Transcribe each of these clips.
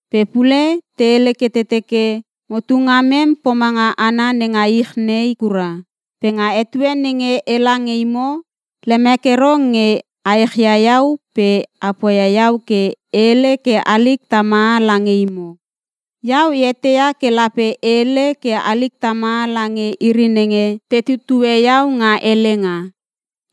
Pe pule te hele ke te teke motu ngamem pomange hana nenga ich nei kura. Pe nga etue nenge ela nge imo, lemek ero nge a echia iau pe a poia iau ke e hele ke halik tamaha lange imo. Iau e eteia ke lape e hele ke halik tamaha lange iri nenge te tutue iau nga helenga.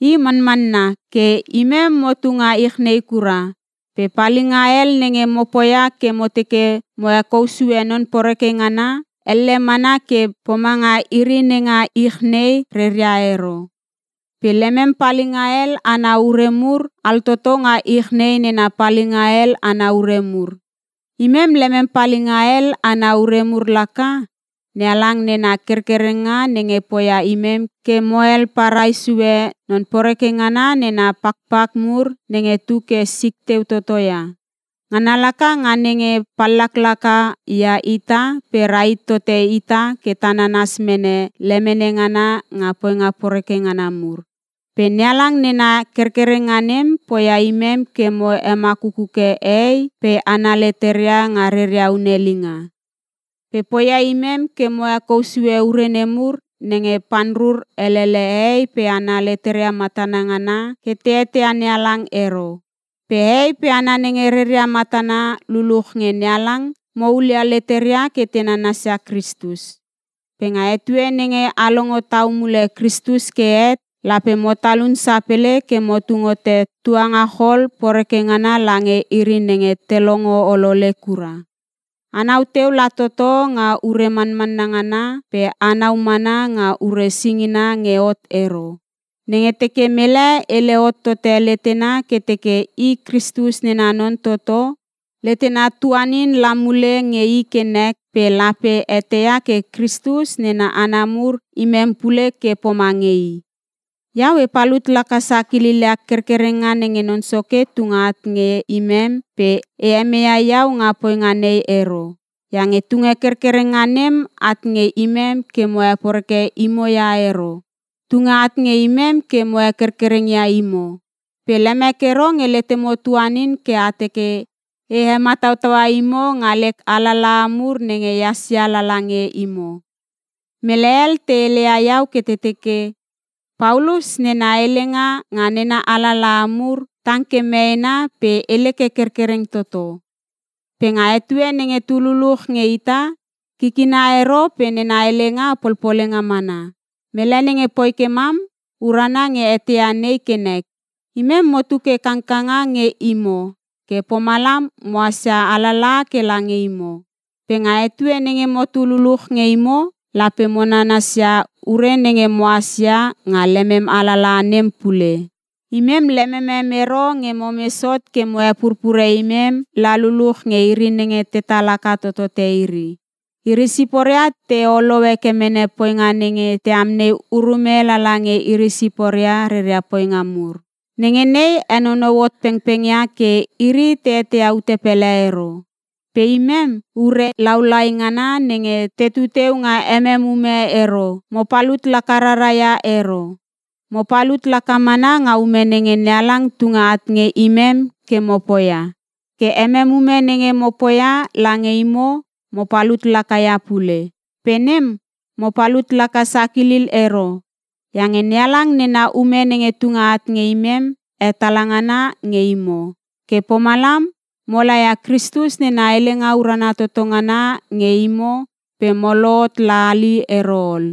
I manmanna ke imem motu nga ich nei kura pe palinga hel nenge mo poia ke mo teke mo hekou sue non poreke ngana, elle mana ke pomanga iri nenga ich nei reria ero. Pe lemem palinga hel ana ure mur, altoto nga ich nei nena palinga hel ana ure mur. Imem lemem palinga hel ana ure mur laka, NeHalang nena kerkerenga nenge poia imem ke mohel parai sue non poreke ngana nena pakpak mur nenge tu ke sik teu toto ia. Ngana laka nga nenge pallaklaka ia ita pe rahit tote ita ke ta nananas mene lemene ngana nga poinga poreke ngana mur. Pe NeHalang nena kerkerenga nem, poia imem ke mo hemakuke hehei pe hana leteria nga reria hunelinga. Pe poia imem ke mo hekou sue ure nemur nenge panrur helele hehei pe hana leteria matana ngana ke te eteia NeHalang ero. Pe hehei pe hana nenge reria matana luluch nge NeHalang, mo hulia leteria ke te nanasia Kristus. Pe nga etue nenge a longo tau mule Kristus ke het lape mo talun sapele ke mo tung hote tuangachol poreke ngana lange iri nenge te longo olole kura. Anau teu la toto nga ure manmanna ngana pe anau mana nga ure singina nge hot ero. Nenge teke mele hele hot tote letena ke teke i Kristus nena non toto, letena tuanin la mule nge i ke nek pe lape eteia ke Kristus nena hana mur imem pule ke pomange i. Iau e palut laka sakilil ia kerkerenga nenge Non Soke tunge at nge imem pe e meia iau nga poinga nei ero. Iange tunge kerkerenga nem at nge imem ke mo heporeke imo ia ero, tunge at nge imem ke mo hekerkereng ia imo. Pe lemek ero nge letemo tuanin ke a teke e he matautaua imo nga lek alalaha mur nenge ehas ia lala nge imo. Mele hel te heleia iau ke te teke, “Paulus nena helenga nga nena alalaha mur, tang ke meena pe hele ke kerkereng toto. Pe nga etue nenge tu luluch nge ita, kikina ero pe nena helenga polpolenga mana.” Mele nenge poi ke mam, urana nge eteia nei ke nek. Imem motu ke kangkanga nge imo ke pomalam mohas ia alalaha ke lange imo. Pe nga etue nenge motu luluch nge imo, lape mo nanasia ure nenge mohas ia nga lemem alalaha nem pule. Imem lememem ero nge momes hot ke mo hepurpure imem la luluch nge iri nenge tetal haka totote iri. Iri siporia te olou heke mene poinga nenge te amnei urume lala nga iri siporia reria poinga mur. Nenge nei henonou hot pengpengia ke iri te eteia ute pele ero. Pe imem, ure hel lau lai ngana nenge tetu teu nga emem ume ero, mo palut laka rara ia ero. Mo palut laka mana nga ume nenge NeHalang tunge at nge imem ke mo poia, ke emem ume nenge mo poia lange imo, mo palut laka ia pule. Pe nem mo palut laka sakilil ero iange NeHalang nena ume nenge tunge at nge imem hetala ngana nge imo. Ke pomalam mo laia Kristus nena helenga urana toto ngana nge imo pe mo lohot la hali ero ol.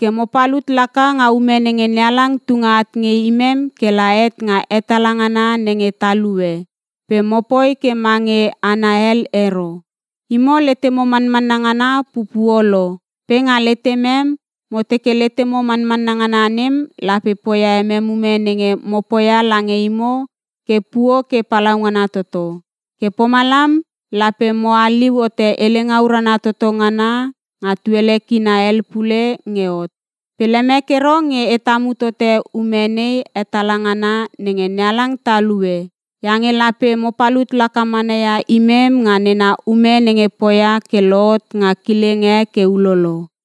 Ke mo palut laka nga ume nenge NeHalang tunge at nge imem kela het nga hetala ngana nenge talue, pe mopoi ke mange hana hel ero. Imo letemo manmanna ngana pupuo lo pe nga letemem, mo teke letemo mamanna ngana nem lape poia emem ume nenge mo poia lange imo ke puo ke palaungana toto. Ke pomalam lape mo haliu hote helenga urana toto ngana nga tuele kina hel pule nge hot. Pe lemek ero nge e tamu tote ume nei hetala ngana nenge NeHalang talue iange lape mo palut laka mana ia imem nga nena ume nenge poia ke lohot nga kileng e ke ulolo.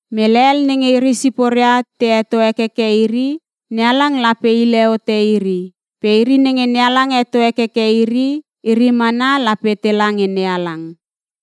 Mele hel nenge iri siporia te heto hekeke iri, NeHalang lape hile hote iri. Pe iri nenge NeHalang heto hekeke iri, iri mana lape tela nge NeHalang.